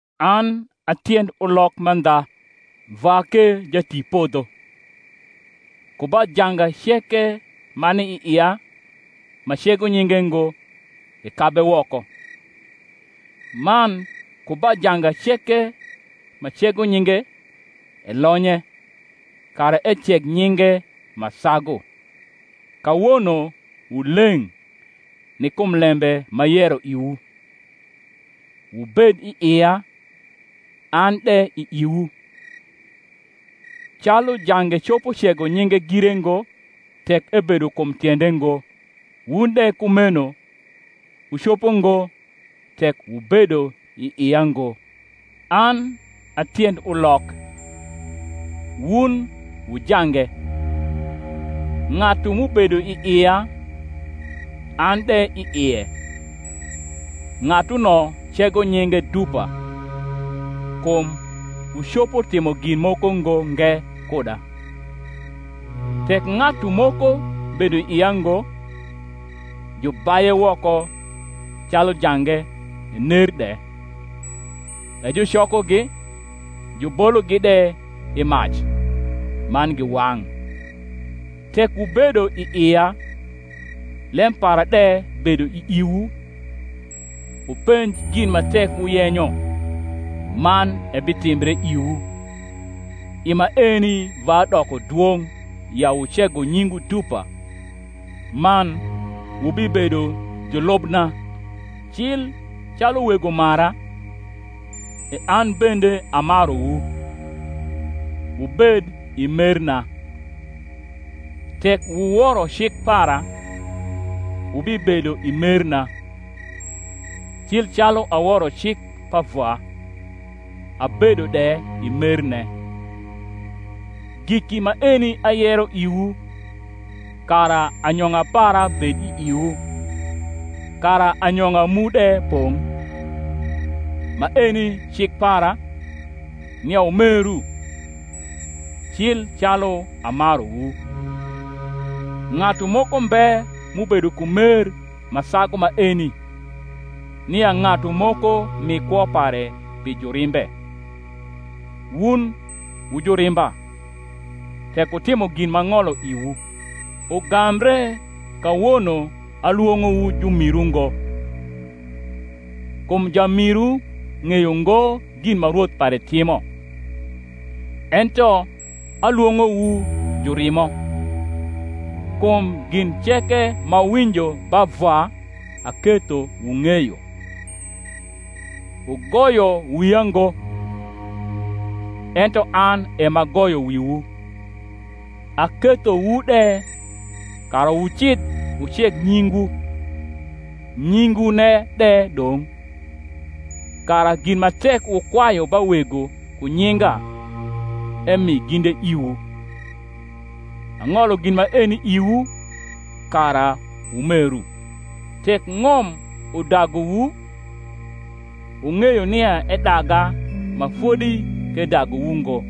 An a tiend ulok mandha, Vwa ke jatipodho. Ku ba janga ceke ma ni i ia ma cego nyinge ngo, ekabe woko: man ku ba janga ceke ma cego nyinge, elonye, kara eceg nyinge ma sagu. Kawono wu leng’ ni kum lembe m’ayero iwu. Wubed i ia, an de i iwu. Calu jange copo cego nyinge gire ngo, tek ebedo kum tiende ngo; wun de kumeno wucopo ngo, tek wubedo i ia ngo. An a tiend ulok, wun wu jange: Ng’atu m’ubedo i ia, an de i ie, ng’atuno cego nyinge dupa: kum wucopo timo gin moko ngo nge kuda. Tek ng’atu moko bedo i ia ngo, jubaye woko calu jange, ener de; e jucokogi, jubologi de i mac, man giwang’. Tek wubedo i ia, lem para de bedo i iwu, wupenj gin ma tek wuyenyo, manebitimbre iwu. I maeni Vwa doko dwong’ ya wucego nyingwu dupa; man wubibedo julubna. Cil calu Wego mara, e an bende amaruwu: wubed i merna. Tek wuworo cik para, wubibedo i merna; cil calu aworo cik pa Vwa, abedo de i merne. Giki maeni ayero iwu, kara anyong’a para bed i iwu, kara anyong’a mu de’pong’. Maeni cik para, nia wumeru, cil calu amaruwu. Ng’atu moko mbe m’ubedo ku mer ma sagu maeni, nia ng’atu moko mi kwo pare pi jurimbe. Wun wu jurimba, tek wutimo gin m’ang’olo iwu. Ugambre kawono alwong’owu jumiru ngo; kum jamiru ng’eyo ngo gin ma Rwoth pare timo: ento alwong’owu jurimo; kum gin ceke m’awinjo ba Vwa aketho wung’eyo. Wugoyo wia ngo, ento an e m’agoyo wiwu, akethowu de, kara wucidh wuceg nyingwu, nyingwune de dong’: kara gin ma tek wukwayu ba Wego ku nyinga, emi ginde iwu. Ang’olo gin maeni iwu, kara wumeru. Tek ng’om udaguwu, wung’eyo nia edaga ma fodi k’edaguwu ngo.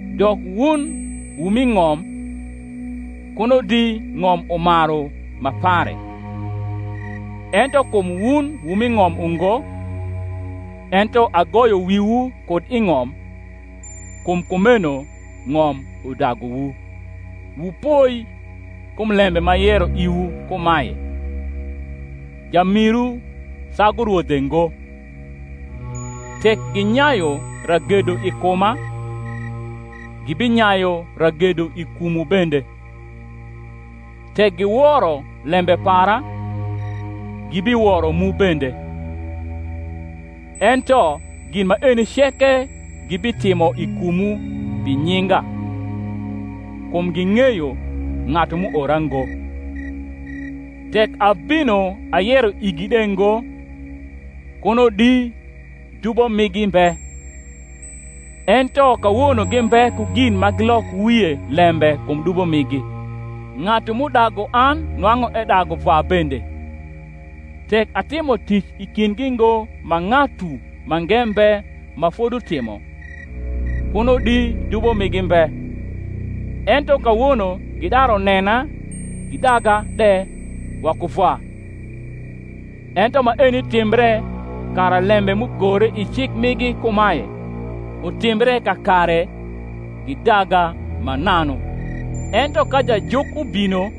Dok wun wu mi ng’om, kuno di ng’om umaru ma pare: ento kum wun wu mi ng’om ungo, ento agoyo wiwu kud i ng’om, kum kumeno ng’om udaguwu. Wupoi kum lembe m’ayero iwu kumae, Jamiru sagu rwodhe ngo. Tek ginyayu ragedo i kuma, gibinyayu ragedo i kumwu bende; tek giworo lembe para, gibiworo mu bende. Ento gin maeni ceke gibitimo i kumwu pi nyinga, kum ging’eyo ng’atu m’uora ngo. Tek abino ayero igLde ngo, kuno di dubo migi mbe: ento kawono gimbe ku gin ma gilok wie lembe kum dubo migi. Ng’atu m’udagu an nwang’u edagu Vwa bende. Tek atimo tic i kindgi ngo ma ng’atu mange mbe ma fodutimo, kuno di dubo migi mbe: ento kawono gidaru nena gidaga de waku Vwa. Ento maeni timbre, kara lembe m’ugore i cik migi kumae, utimbre kakare, Gidaga mananu. Ento ka Jajuk ubino,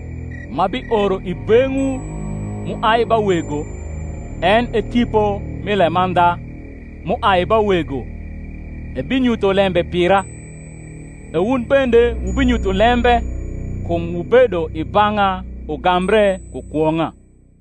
m’abioro i beng’wu m’uai ba Wego, en e Tipo mi lemandha, m’uai ba Wego, ebinyutho lembe pira: e wun bende wubinyutho lembe, kum wubedo i bang’a ugambre ku kwong’a.